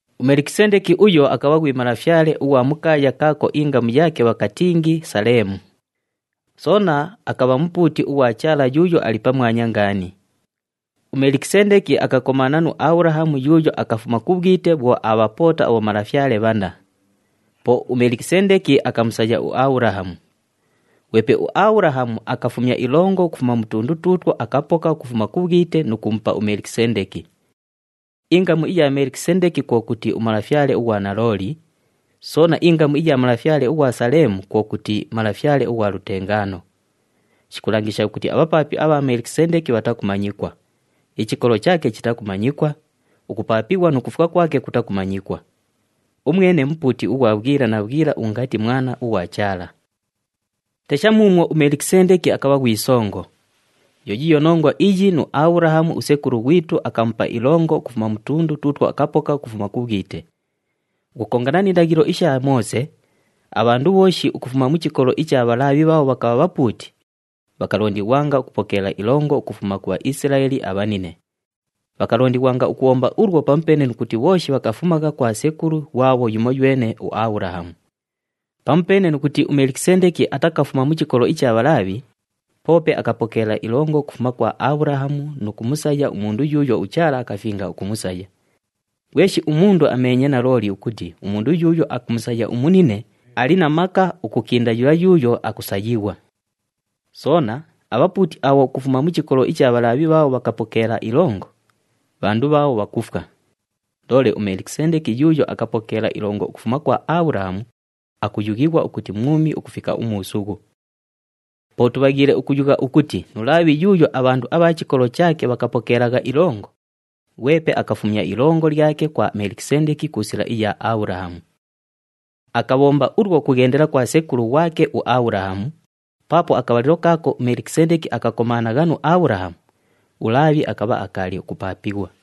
UMelikisendeki uyo akabha ghwi malafyale ughwa mu kaaya kaako ingamu yaake bhakatingi Saleemu. Soona akabha mupuuti ughwa Chaala Yuuyo Ali Pamwanya Ngaani. UMelikisendeki akakomaana nu Abhulahamu yuuyo akafuma ku bhwite bhwo aabhapoota abhomalafyale bhanna. Po uMelikisendeki akamusaya uAbhulahamu. Ghwepe uAbhulahamu akafumya ilongo ukufuma mu tundu tuutwo akapoka ukufuma ku bhwite nu kumupa uMelikisendeki. Ingamu iya Melikisendeki kwo kuti malafyale ughwanalooli, soona ingamu iya malafyale ughwa Saleemu kwo kuti malafyale ughwa lutengaano. Shikulangisha ukuti abhapaapi abha Melikisendeki bhatakumanyikwa, ichikolo chaake chitakumanyikwa, ukupaapighwa nu kufwa kwake kutakumanyikwa. Umwene mupuuti ughwa bhwila na bhwila ungati Mwana ughwa Chaala. Tesha muumwo uMelikisendeki akabha ghwi songo! Yo yiiyo nongwa iyi nu Abhulahamu usekulu ghwitu akamupa ilongo ukufuma mu tundu tuutwo akapoka ukufuma ku bhwite. Ukukongana ni ndaghilo isha Moose, abhandu bhooshi ukufuma mu chikolo icha Bhalaabhi bhaabho bhakabha bhapuuti, bhakalondighwanga ukupokeela ilongo ukufuma ku Bhaisilaeli abhanine. Bhakalondighwanga ukubhomba ulwo pamupeene nu kuti bhooshi bhakafumagha kwa sekulu ghwabho yumoywene uAbhulahamu. Pamupeene nu kuti uMelikisendeki atakafuma mu chikolo icha Bhalaabhi, poope akapokeela ilongo ukufuma kwa Abhulahamu nu kumusaya umundu yuuyo uChaala akafinga ukumusaya. Ghweshi umundu ameenye nalooli ukuti umundu yuuyo akumusaya umunine, ali na maka ukukinda yula yuuyo akusayighwa. Soona, abhapuuti abho ukufuma mu chikolo icha Bhalaabhi bhaabho bhakupokeela ilongo, bhandu bhaabho bhakufwa. Loole uMelikisendeki yuuyo akapokeela ilongo ukufuma kwa Abhulahamu, akuyughighwa ukuti mwumi ukufika umuusughu. Po tubhaghiile ukuyugha ukuti nu Laabhi yuuyo abhandu abha chikolo chaake bhakupokeelagha ilongo, ghwepe akafumya ilongo lyake kwa Melikisendeki ku sila iya Abhulahamu. Akabhomba ulwo ukughendela kwa sekulu ghwake uAbhulahamu, paapo akabhalilo kaako uMelikisendeki akakomaanagha nu Abhulahamu, uLaabhi akabha akaali ukupaapighwa.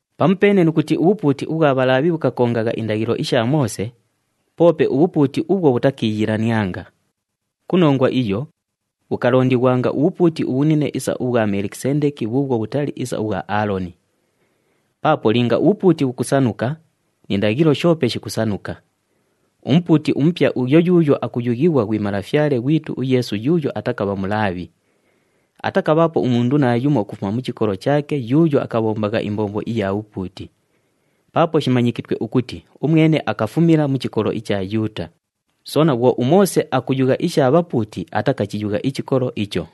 Pamupeene nu kuti ubhupuuti ubhwa Bhalaabhi bhukakongagha indaghilo isha Moose, poope ubhupuuti ubhwo bhutakiiyilanianga. Ku nongwa iyo, bhukalondighwanga ubhupuuti ubhunine isa ubhwa Melikisendeki bhuubhwo bhutali isa ubhwa Aaloni. Paapo linga ubhupuuti bhukusanuka, ni ndaghilo shoope shikusanuka. Umupuuti umupya uyo yuuyo akuyughighwa ghwi Malafyale ghwitu uYeesu yuuyo atakabha Mulaabhi. Atakabhaapo umundu naayumo ukufuma mu chikolo chaake yuuyo akabhombagha imbombo iya bhupuuti. Paapo shimanyikitwe ukuti umwene akafumila mu chikolo icha Yuuta, soona bhwo uMoose akuyugha isha bhapuuti atakachiyugha ichikolo icho.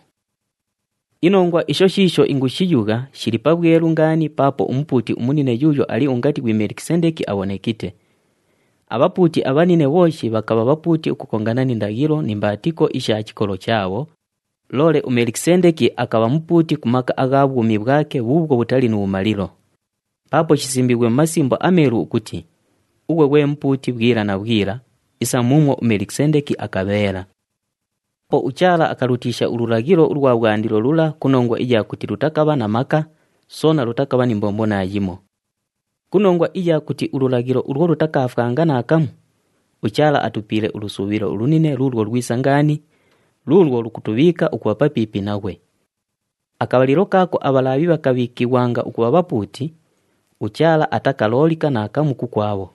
Inongwa isho shiisho ingushiyugha shili pabhwelu ngaani paapo uMupuuti umunine yuuyo ali ungati ghwi Melikisendeki abhonekite. Abhapuuti abhanine bhooshi bhakabha bhapuuti ukukongana ni ndaghilo ni mbaatiko isha chikolo chaabho, loole uMelikisendeki akabha mupuuti ku maka agha bhwumi bhwake bhuubhwo bhutali nu bhumalilo. Paapo shisimbiighwe mu Masimbo aMeelu ukuti, “Ughwe ghwe Mupuuti bhwila na bhwila, isa muumwo uMelikisendeki akabheela.” Po uChaala akalutiisha ululaghilo ulwa bhwandilo lula ku nongwa iya kuti lutakabha na maka, soona lutakabha ni mbombo naayimo. Ku nongwa iya kuti ululaghilo ulwo lutakaafwanga naakamu, uChaala atupiile ulusuubhilo ulunine luulwo lwisa ngaani, luulwo lukutubhiika ukubha papiipi naghwe. Akabhalilo kaako aBhalaabhi bhakabhiikighwanga ukubha bhapuuti, uChaala atakaloolika naakamu kukwabho.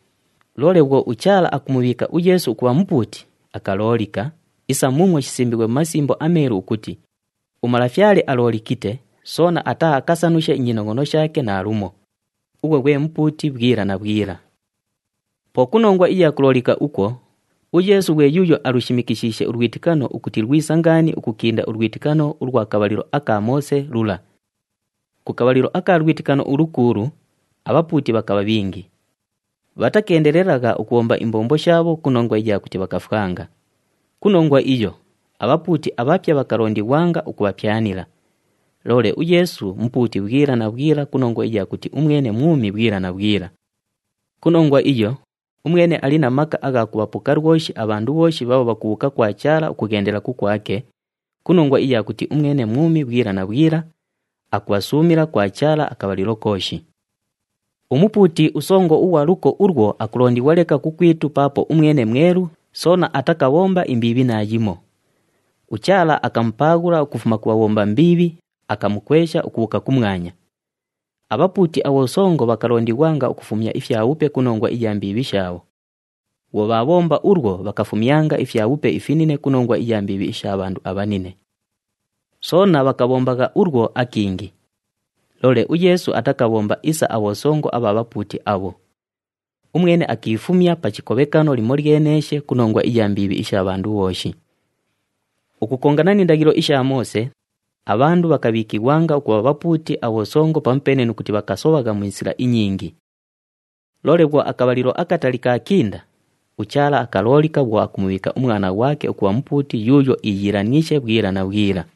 Loole bhwo uChaala akumubhiika uYeesu ukubha Mupuuti, akaloolika, isa muumwo shisimbiighwe mu Masimbo aMeelu ukuti, “UMalafyale aloolikite, soona ataaakasanushe inyinongʼono shaake naalumo. Ughwe ghwe Mupuuti bhwila na bhwila.” Po ku nongwa iya kuloolika ukwo, uYeesu ghwe yuuyo alushimikishiishe ulwitikano ukuti lwisa ngaani ukukinda ulwitikano ulwa kabhalilo aka Moose lula. Ku kabhalilo aka lwitikano ulukuulu, abhapuuti bhakabha bhingi. Bhatakeendelelagha ukubhomba imbombo shaabho ku nongwa iya kuti bhakafwanga. Ku nongwa iyo, abhapuuti abhapya bhakalondighwanga ukubhapyanila. Loole uYeesu, Mupuuti bhwila na bhwila ku nongwa iya kuti umwene mwumi bhwila na bhwila. Ku nongwa iyo, umwene ali na maka agha kubhapoka lwoshi abhandu bhooshi bhaabho bhakubhuuka kwa Chaala ukughendela kukwake, ku nongwa iya kuti umwene mwumi bhwila na bhwila, akubhasuumila kwa Chaala akabhalilo kooshi. UMupuuti uSongo ughwa luko ulwo akulondighwa leka kukwitu paapo umwene mwelu, soona atakabhomba imbiibhi naayimo. UChaala akamupaaghula ukufuma ku bhabhomba mbiibhi, akamukwesha ukubhuuka kumwanya. Abhapuuti abhosongo bhakalondighwanga ukufumya ifyabhupe ku nongwa iya mbiibhi shaabho. Bhwo bhaabhomba ulwo, bhakafumyanga ifyabhupe ifinine ku nongwa iya mbiibhi isha bhandu abhanine. Soona bhakabhombagha ulwo akingi. Loole uYeesu atakabhomba isa abhosongo abha bhapuuti abho. Umwene akiifumya pa chikobhekano limolyeneeshe ku nongwa iya mbiibhi isha bhandu bhooshi. Ukukongana ni ndaghilo isha Moose, abhandu bhakabhiikighwanga ukubha bhapuuti abhosongo pamupeene nu kuti bhakasobhagha mu sila inyingi. Loole bhwo akabhalilo akatali kaakinda, uChaala akaloolika bhwo akumubhiika uMwana ghwake ukubha Mupuuti yuuyo iiyiilaniishe bhwila na bhwila.